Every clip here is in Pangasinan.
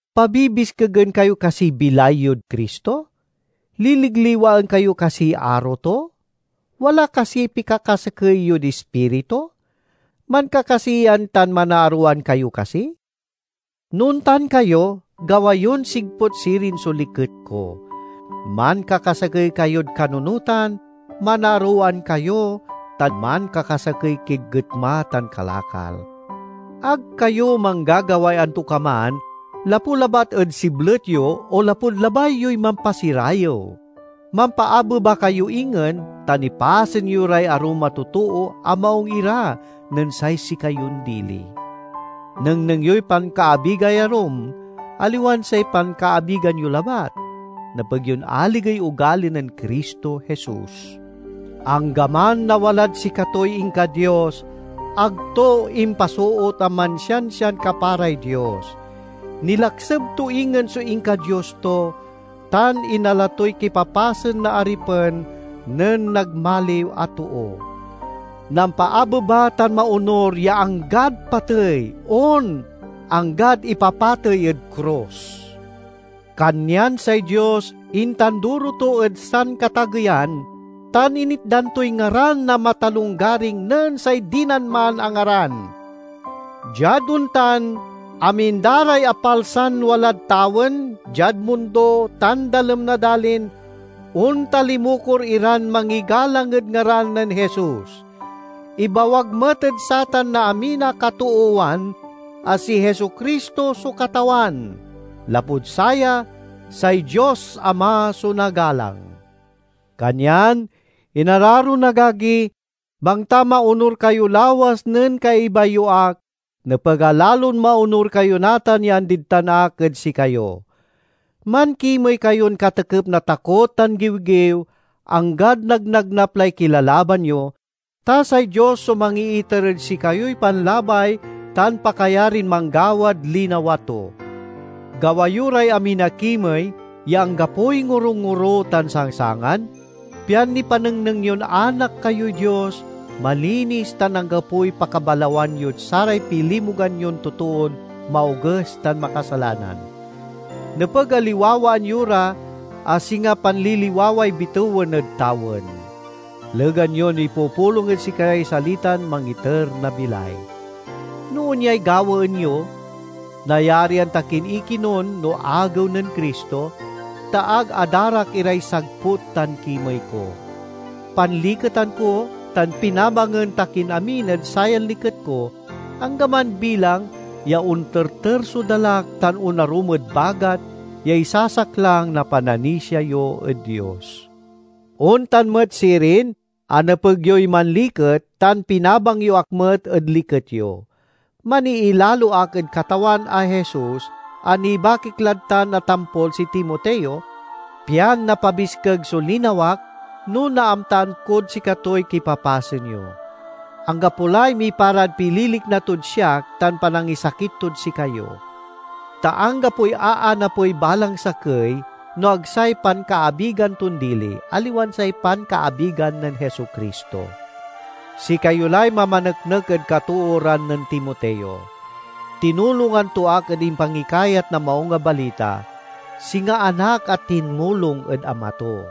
Pabibiskegen kayo kasiy bilay yod Cristo? Liligliwaen kayo kasiy aro to? Wala kasiy pikakasakey yod Ispirito? Mankakasiyan tan manaarowan kayo kasi? No ontan kayo, gawa yon sigput sirin so liket ko—mankakasakey kayod kanunotan, manaarowan kayo, tan mankakasakey kid getma tan kalakal. Ag kayo manggagaway antokaman lapu labat ed siblet yo o lapud labay yoy mampasirayew; mampaabeba kayo ingen tan ipasen yo ray arum a totoo a maung ira nen say sikayon dili. Nengneng yoy pankaabigay arum, aliwan say pankaabigan yo labat. Nepeg yon aligey ogali nen Cristo Jesus: Anggaman a walad sikatoy inka-Dios, ag to impasoot a mansiansian kaparay Dios. Nilakseb to ingen so inka-Dios to, tan inala toy kipapasen na aripen nen nagmaliw a too. Nampaabeba tan maonur ya anggad patey— on, anggad ipapatey ed krus. Kanyan say Dios intanduro to ed sankatageyan, tan initdan toy ngaran a matalonggaring nen say dinan man a ngaran. Diad ontan, amin da ray apalsan walad tawen, diad mundo tan dalem na dalin. ontalimukor iran mangigalang ed ngaran nen Jesus. Ibawag met ed satan na amin a katoowan a si Jesu-Cristo so Katawan. Lapud saya, say Dios Ama so nagalang. Kanyan, inararon agagi, bangta maonur kayo lawas nen kaiba yo ak, nepeg a lalon maonur kayo natan ya andid tan ak ed sikayo. Mankimey kayon katekep na takot tan giwgiw anggad nagnagnap lay kilalaban yo, ta say Dios so mangiiter ed sikayoy panlabay tan pakayarin manggawad linawa to. Gawa yo ray amin a kimey ya anggapoy ngorongoro tan sangsangan, pian nipanengneng yon anak kayoy Dios, malinis tan anggapoy pakabalawan yod saray pilimugan yon totoon maoges tan makasalanan. Nepeg a liwawaan yo ra a singa panliliwaway bitewen ed tawen, legan yon ipupulong ed sikaray salitan mangiter na bilay. No onyay gawaen yo, nayarian ta kin ikinun no Agew nen Cristo, ta ag adarak iray sagput tan kimey ko. Panliketan ko tan pinabangen ta kin amin ed sayan liket ko, anggaman bilang ya onterter so dalak tan onarum ed bagat ya isasaklang na pananisia yo ed Dios. Ontan met sirin a nepeg yoy manliket, tan pinabang yo ak met ed liket yo. Maniilalo ak ed Katawan a Jesus a nibakik lad tan a tampol si Timoteo, pian napabiskeg so linawak no naamtaan kod sikatoy kipapasen yo. Anggapo lay miparad pililikna tod siak tan panangisakit tod sikayo. Ta anggapoy aanapey balang sakey no ag say pankaabigan ton dili, aliwan say pankaabigan nen Jesu-Cristo. Sikayo lay mamaneknek ed katooran nen Timoteo. Tinulongan to ak ed impangikayat na Maung a Balita; singa anak a tinmulong ed ama to.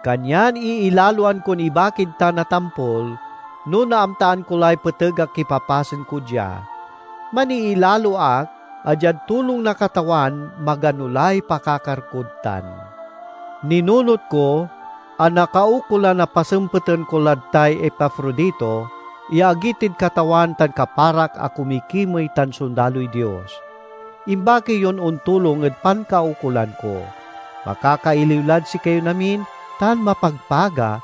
Kanyan iilaloan kon ibakid tan a tampol no naamtaan ko lay peteg a kipapasen ko dia. Maniilalo ak a diad tulong na Katawan magano lay pakakar kod tan. Ninunot ko a nakaukolan a pasempeten ko lad tay Epafrodito, ya agi tid Katawan tan kaparak a kumikimey tan sondaloy Dios. Imbaki yon ontulong ed pankaukolan ko. Makakailiw lad sikayon amin tan mapagpaga,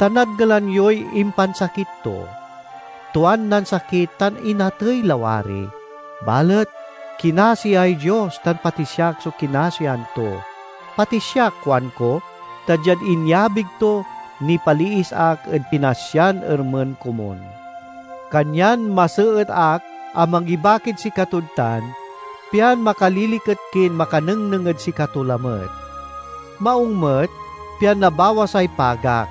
ta nadngelan yoy impansakit to. Tuan nansakit tan inatey lawari, balet kinasiay Dios tan pati siak so kinasian to. Pati siak kuanko, ta diad inyabig to nipaliis ak ed pinasyan ermen komun. Kanyan maseet ak a mangibakid sikatod tan, pian makaliliket kin makanengneng ed sikato lamet. Maung met pian nabawasay pagak.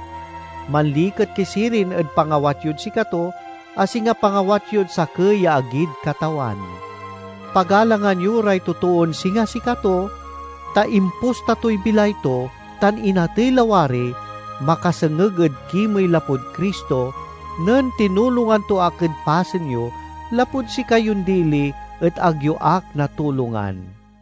Manliket ki sirin ed pangawat yod sikato a singa pangawat yod sakey ya agid Katawan. Pagalangan yo ray totoon singa sikato, ta imposta toy bilay to tan inatey lawari makasengeg ed kimey lapud Cristo nen tinulongan to ak ed pasen yo, lapud sikayon dili et ag yo ak natulongan.